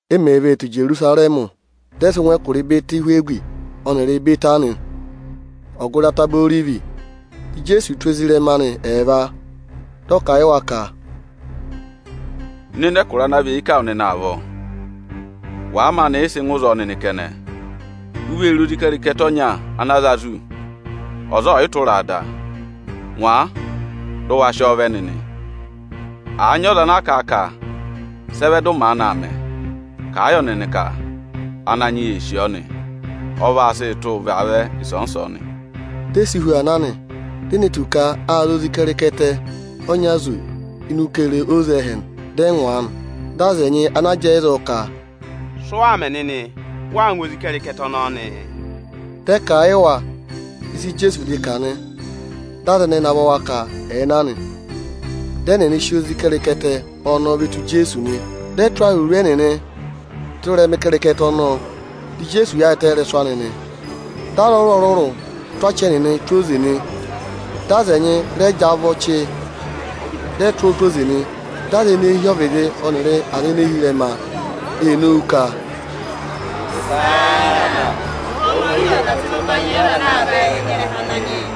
E mèe vee tù Ijerusarẹmị, dị ẹ sị ngụ ẹkụra Ịbẹtị-Ihwegi ọnịrị Ịbẹtanị, ọgụrị Ataba Orivi. Dị Ijeesu tụ́ ezirẹma anị ẹẹva, dị ọ kà a yị wa ka, “Nọ ịnị ẹkụra ana và eyi ká wụ nịnị avọọ! Wàa maanị yị sị ngụ ịzọọ nịnị kẹnẹ, u vee re ozi ịkẹrịkẹtẹ ọnya anaa za zù, ọza ọọ̀yị tụra a da. Ngwa a, dị ụ waa sị ọọ vẹ nịnị! Àa nyị ọza ana kà a ka: ‘Sị ẹ vẹ dị ụ maanị aa mẹ?’ Kà a yọ nịnị ka, ‘Ananyị yị ee sì ọọ nị; Ọ vaa sịị tụ́ vaavẹ ịsọọnị-ịsọọnị.’” Di e si hu aa na nị. Ệ ne tù ka â za ozi ịkẹrịkẹtẹ ọnya zù ini ukere oze ẹ́hẹ. Dị ẹ ngwa a nị. Dị aza ẹnyị ana jẹẹ ịzọọ ka, “Sị ụ waa mẹ nịnị? Ụ waa ngwa ozi ịkẹrịkẹtẹ ọnọọ nịị?” Dị ẹ kà a yị wa ịsị Ijeesu vịdị kà nị. Dị aza ẹnẹẹ navọ wa ka ẹ̀ẹ na nị. Dị ẹnịnị sị ozi ịkẹrịkẹtẹ ọnọọ ve tù Ijeesu nị. Dị ẹ tụ́ awuru ẹnịnị tụ́ ịrẹma ịkẹrịkẹtẹ ọnọọ, dị Ijeesu yaayịtẹ ị́rẹsụ anị nị. Dị aza ọrụrụ-ọrụrụ tụ́ achị ẹnịnị tụ́ oze nị, dị aza ẹnyị rẹ jị avọ́ ọchị, dị ẹ tụ́ ọọ tụ́ oze nị. Dị aza ene hi ọvịdị ọnịrị aza ene hi ịrẹma ee nowu ka, “Ihosana! Ohomorihi ọ̀ dà tụ́ ịnị ụbanyị yị ọza ana aa vẹ ịnị ịrẹha Ananyị yị!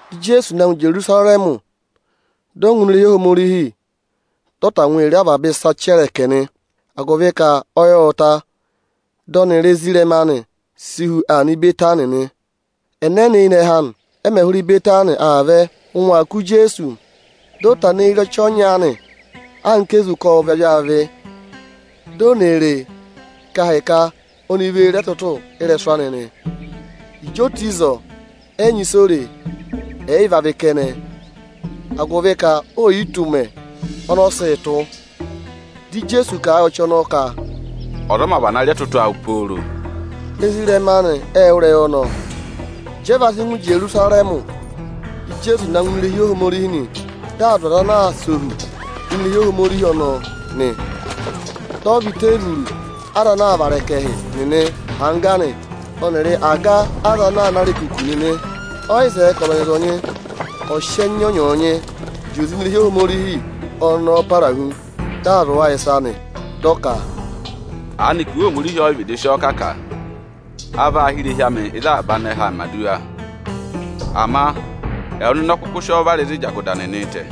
Dị Ijeesu na ngụ Ijerusarẹmị, dị ọ ngụ ini irehi Ohomorihi, dị ọ tangwa re avaba ịsa chẹrẹkẹ nị. Agụvị ka ọyị ộ ta, dị ọnịrị ezirẹma anị si hu aa nọ Ịbẹtanị nị. Ẹnẹnẹ eyinẹhẹ anị, ẹ mẹ̀ hụrẹ Ịbẹtanị aa vẹ, ụngwẹ aa kụ̀ Ijeesu. Dị ọ tana eyi re ọchị ọnya aanị ana sị mẹẹ anka ezu ka ộ vị avị-avị nị. Ô ne re e ka ahịka oni vee re ẹtụtụ ị́rẹsụ anị nị. Ịjị o tù ịzọọ, ẹ yị nyị ịsị o re, ẹ̀ yị vị avị kẹnẹ, agụvị ka eè yi tù ụmẹ ọnị ọ sịị̄ tụ́. Dị Ijeesu kà a yị ọchị ọnọọ ka, “Ọza ọ mā vana rị ẹtụtụ awụ pooro.” Ezirẹma anị ệ wụ́ ịrẹyị ọnọọ. Ịjị ẹ va sị ngụ Ijerusarẹmị, dị Ijeesu na ngụ ini irehi Ohomorihi nị. Dị aa dụ aza ana aa sẹ ohu ini irehi Ohomorihi ọnọọ nị. Dị ọ và iteevuru aza anaā vara ẹkẹhị nịnị, ọnịrị aga aza anaā ná arekuku nịnị angga nị. Ọ yị zẹẹ ka ọzọnyị-ọzọnyị ọ̀ sị ẹnya ọnyọọnyị zị oze ini irehi Ohomorihi ọnọọ para hu. Dị aa zụ̀ wa ịsa nị, dị ọ ka, “Aanịka Iwe Ohomorihi ọ yị vịdị sị ọọ kà ka: ‘A vaa hị́ irehi amị ịzị avaba anẹhẹẹ̄ mẹ̀ aduwa’? Ama ẹwụ nịnị ọ kụkụ sị ọọ vara ịzị anako nịnịị̄ tẹ̀.”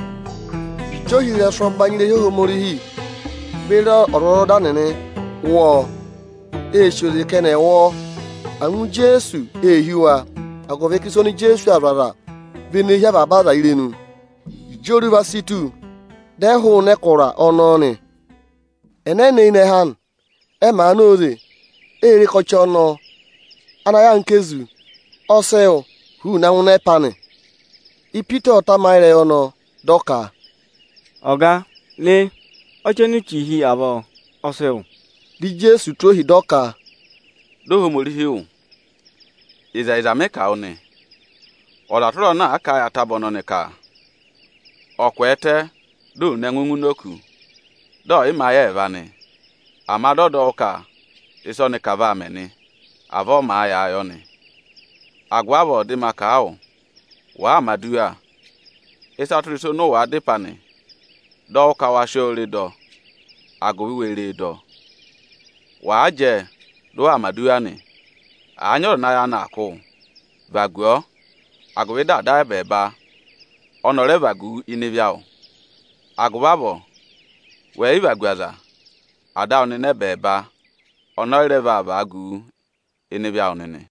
Ịjị ohirẹsụ ẹbanyị irehi Ohomorihi beri ọzwọzọda nịnị wụ́ ọọ, ê sì oze ka ẹnị ẹ̀ wụ ọọ. Angwa Ijeesu ee hí wa, agụvị ka ịsa oni Ijeesu aa zụ̀ aza vị ene hí avaba aza irenu. Ịjị oruva si tù, dị ẹ hụụnị ẹkụra ọnọọ nị. Ẹnẹnẹ eyinẹhẹ anị, ẹ màa na óze, ê re ka ọchị ọnọọ (ana yà anka ezu) ọ sị wụ huuu na ngụ ịnị ẹpa anị. Ipita ộ tamayị ịrẹyị ọnọọ, dị ọ ka, “Ọga, re! Ọchị oni u chì hi avọọ, ọ sị wụ ọ!” Dị Ijeesu tụ́ ohi, dị ọ ka, “Dọ Ohomorihi wụ́! Ịkọ 13.2Ịzẹyịza mị kà a wụ nị, ọza tụra ọza ana àa kà a yị ataba ọnọnị ka ọ̀ kwẹẹtẹ di ò ne ẹngụ ngụ ini òkū, dị ọ̀ yị mẹ ayị ẹẹva nị, ama dị ọ dọ wụ́ ka ịsị ọnị kà vaa mẹ nị, avọọ ọ màa yàa yọ nị. Agụvị avọọ dị ma kà a wụ, wàa mẹ̀ aduwa, ịsa tụra ịsa ọnị ụ wàa dá ịpẹ anị, dọ wụ́ ka wa sị ọọ re dọ, agụvị we re e dọ. Wàa jẹẹ, dị ụ waa mẹ̀ aduwa nị, àa nyị ọza ana ayị anị aa kụ́ wụ, vagu ọọ, agụvị dị Ada awụ ẹbẹẹba ọnị ọ̀ rẹ vagu wu ịnị ịvị awụ [Agụvị avọọ wẹ̀ yị vagu aza, Ada awụ nịnị ẹbẹẹba ọnị ọ yị rẹ vaa vagu wu ịnị ịvị awụ nịnị.”]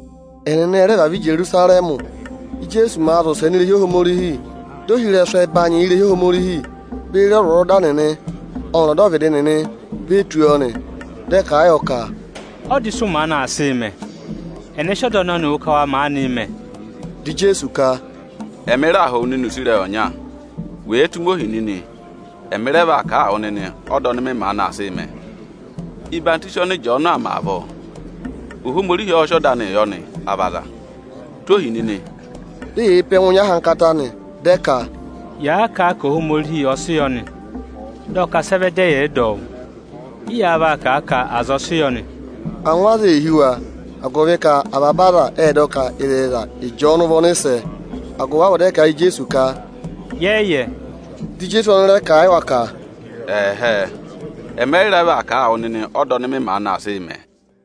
Ẹnịnị ẹ rẹ vavẹ Ijerusarẹmị. Íjeesu màa zị ụsẹ ini irehi Ohomorihi, dị ohirẹsụ ẹbanyị irehi Ohomorihi beri ọzwọzọda nịnị ọnịrị ọdọvịdị nịnị ve tù ọọ nị. Dị ẹ kà a yọ ka, “Ọda ịsị ụ maanị aa sịị mẹ? Ẹnẹ sị ọda ọnọnịị wụ ka wa maanịị mẹ?” Dị Ijeesu ka, “Ẹmị raa họ̀ wụ nịnị use ịrẹyị ọnya. Wèe tụ́ mi ohi nịnị, ẹmị rẹ vaa kà a wụ nịnị ọda ọnị mị maanị aa sịị mẹ: Ọyịhwọzenyi ọnị Ịjọọnụ aa mẹ avọọ, Ohomorihi ọ́ọ́ sị ọda anịị yọ nị, à vị aza? Tụ́ ohi nịnị!” Di eyee pe ẹngụ nyị ahankata nị, dị ẹ ka, “Yàa kà a ka ‘Ohomorihi ọ sị yọ nị’, dị ọ ka sị ẹ vẹ dị ẹyị ẹ̀ yị dọ ọ wụ́? Ị́ yáá vaa kà a ka ‘aza ẹ sị yọ nị?’” Angwa aza ée hí wa, agụvị ka avaba aza ệ dọ ka, ịzẹyịza, Ịjọọnụ vị ọnịsẹ. Agụvị avọọ dị ẹ kà a yị Ijeesu ka, “Yẹ yị yẹ.” Dị Ijeesu ọnị rẹ kà a yị wa ka, “Ẹ̀hẹẹ, ẹmị ẹ yị rẹ vaa kà a wụ nịnị ọda ọnị mị maanị aa sịị mẹ.”